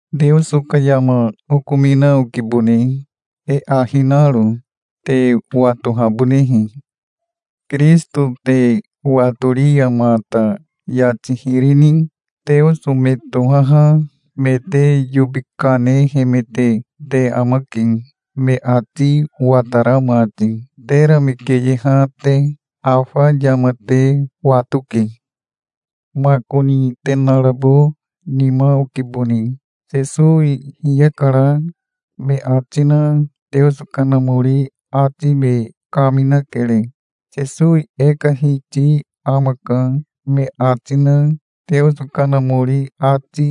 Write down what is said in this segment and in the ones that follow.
Teoso ka yama okomina okibone, e ahi naro, te watohabonehe. Kirisito te watori ya mata yati hiri ni teoso me tohaha me te yobi kanehemete te amake, me ati watara mati, tera me keyeha te. Afa yama te watoke. Makoni te narabo nima okibone. "Sesowi hiyakara", me ati na Teoso Kanamori ati me kaminakere. "Sesowi e ka Hiti amaka", me ati na Teoso Kanamori ati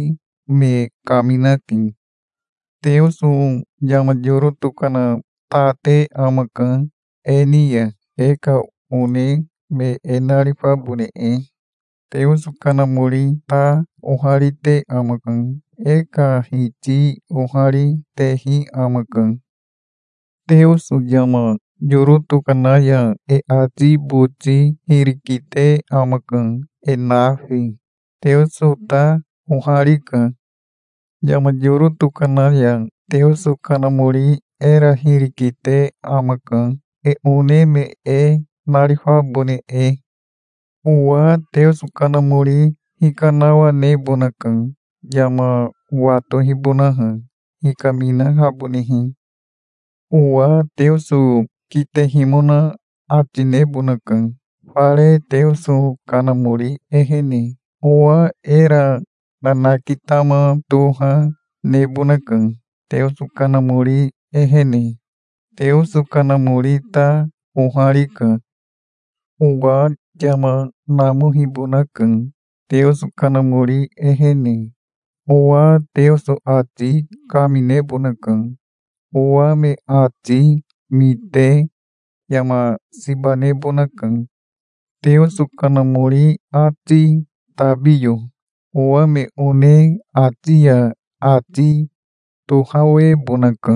me kaminake. Teoso yama yoro tokana ta te amaka e ni ya, e ka one me e narifabone e. Teoso Kanamori ta oharite amaka. E ka Hiti ohari, tehi amaka. Teoso yama yoro tokana ya e ati boti hiri kite amaka, e nafi. Teoso ta oharika. Yama yoro tokana ya Teoso Kanamori era hiri kite amaka, e one me e narifabone e. Owa Teoso Kanamori hikanawanebonaka, yama watohibonaha, hikaminahabonehe. Owa Teoso kitehimona ati nebonaka, fare Teoso Kanamori ehene. Owa era nanakitama toha nebonaka, Teoso Kanamori ehene. Teoso Kanamori ta oharika. Owa yama namohibonaka, Teoso Kanamori ehene. Owa Teoso ati kaminebonaka. Owa me ati mite yama siba nebonaka Teoso Kanamori ati tabiyo. Owa me one ati ya ati tohawebonaka.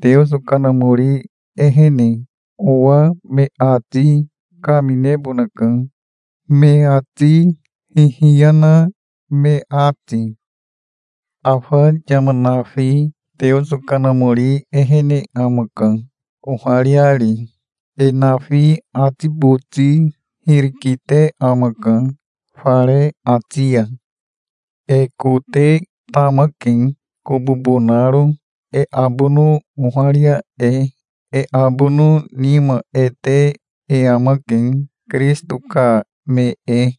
Teoso Kanamori ehene owa me ati kaminebonaka, me ati hihiya na me ati. Afa yama nafi Teoso Kanamori ehene amaka, ohariari. E nafi ati boti hiri kite amaka, fare ati ya. E kote tamake, kobobo naro, e abono oharia e. E abono nima e te e amake, Kirisito ka me e.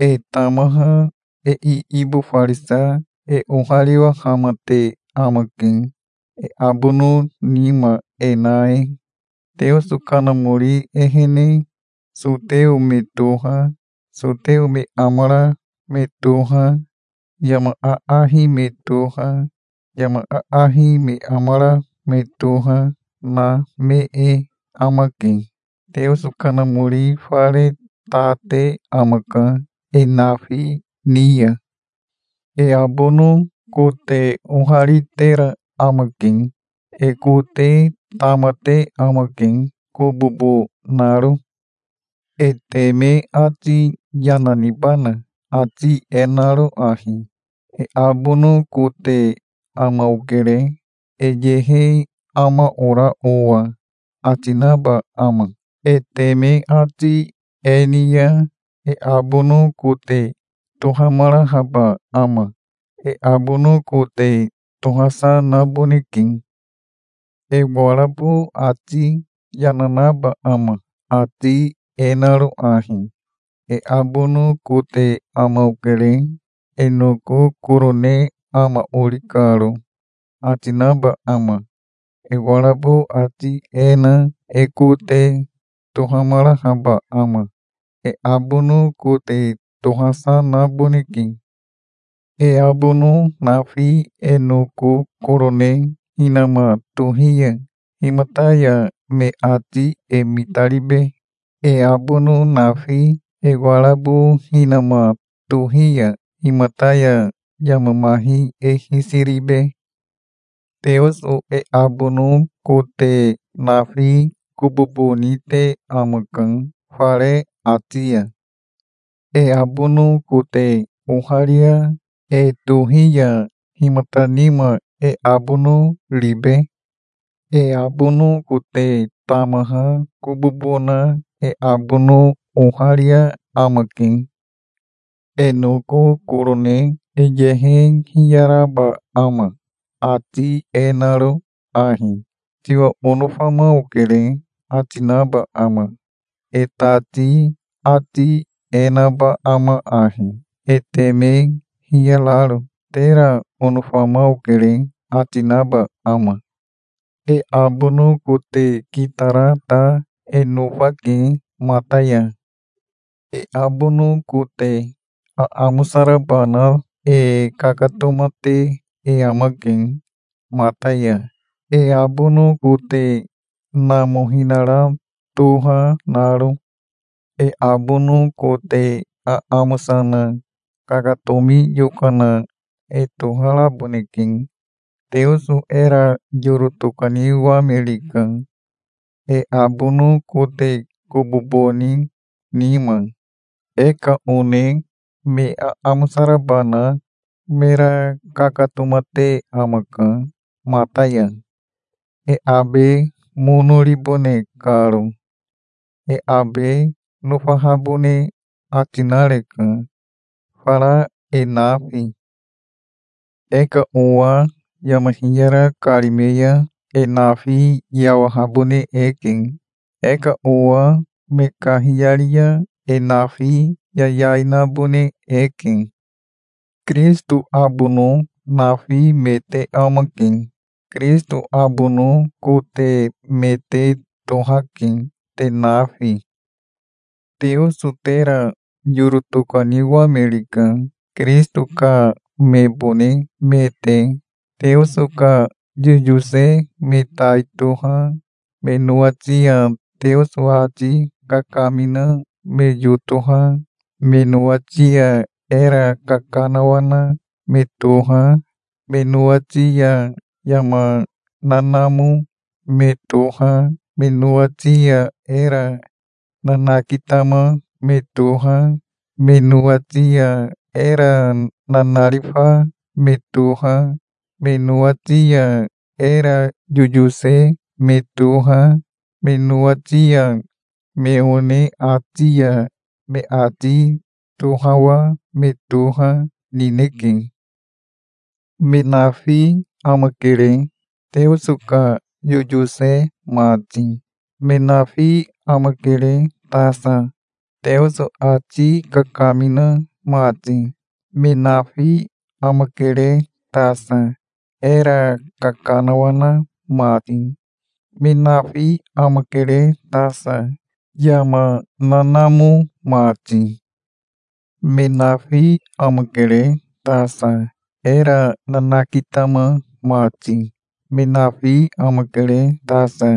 E tamaha e iibofarisa e ohariwahamate amake, e abono nima e na e. Teoso Kanamori ehene soteo me toha, soteo me amara me toha, yama aahi me toha, yama aahi me amara me toha, na me e amake. Teoso Kanamori fare ta te amaka e nafi ni ya. E abono kote oharitera amake. E kote tamate amake, kobobo naro. E teme ati yana nibana, ati e naro ahi: "E abono kote ama okere, e yehe ama ora owa", ati naba ama? E teme ati e ni ya e abono kote tohamarahaba ama? E abono kote tohasa naboneke. E warabo ati yana naba ama, ati e naro ahi: "E abono kote ama okere, e noko korone ama ori karo", ati naba ama? E warabo ati e na e kote tohamarahaba ama? E abono kote tohasa naboneke. E abono nafi e noko korone hinama tohi ya, himata ya me ati e mitaribe? E abono nafi e warabo hinama tohi ya himata ya yama mahi e hisi ribe? Teoso e abono kote nafi kobobo nite amaka, fare ati ya. E abono kote oharia e tohi ya himata nima e abono ribe? E abono kote tamaha kobobo na e abono oharia amake. E noko korone e yehe hiyaraba ama, ati e naro ahi: "Tiwa onofama okere", ati naba ama? E tati ati e naba ama ahi, e teme hiyararo: "Tera onofama okere", ati naba ama? E abono kote kitara ta e nofake mata ya. E abono kote aamosa raba na e kakatomate e amake mata ya, e abono kote namohinara toha naro. E abono kote aamosa na kakatomi yokana e toharaboneke. Teoso era yoro tokaniwamerika, e abono kote kobobo ni nima. E ka one me aamosa raba na mera kakatomate amaka mata ya, e abe mono ribone karo. E abe nofahabone ati nareka, fara e nafi. E ka owa yama hiyara karime ya e nafi yawahabone eke. E ka owa me kahiyari ya e nafi yayai nabone eke. Kirisito abono nafi me te amake. Kirisito abono kote me te tohake, te nafi. Teoso tera yoro tokaniwamerika, Kirisito ka mebone me te. Teoso ka yoyose me tai toha, me nowati ya Teoso ati kakamina me yotoha, me nowati ya era kakanawana me toha, me nowati ya yama nanamo me toha, me nowati ya era nanakitama me toha, me nowati ya era nanarifa me toha, me nowati ya era yoyose me toha, me nowati ya me one ati ya me ati tohawa me toha, nineke. Me nafi amakere, Teoso ka yoyose mati. Me nafi amakere tasa, Teoso ati kakamina mati. Me nafi amakere tasa, era kakanawana mati. Me nafi amakere tasa, yama nanamo mati. Me nafi amakere tasa, era nanakitama mati. Me nafi amakere tasa,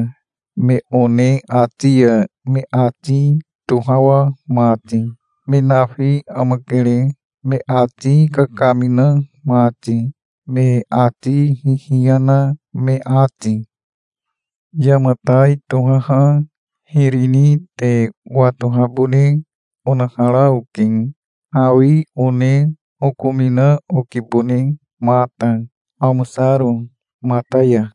me one ati ya me ati tohawa mati. Me nafi amakere, me ati kakamina mati, me ati hihiya na me ati. Yama tai tohaha hiri ni te watohabone onahara oke. Hawi one okomina okibone mata, amosaro mata ya.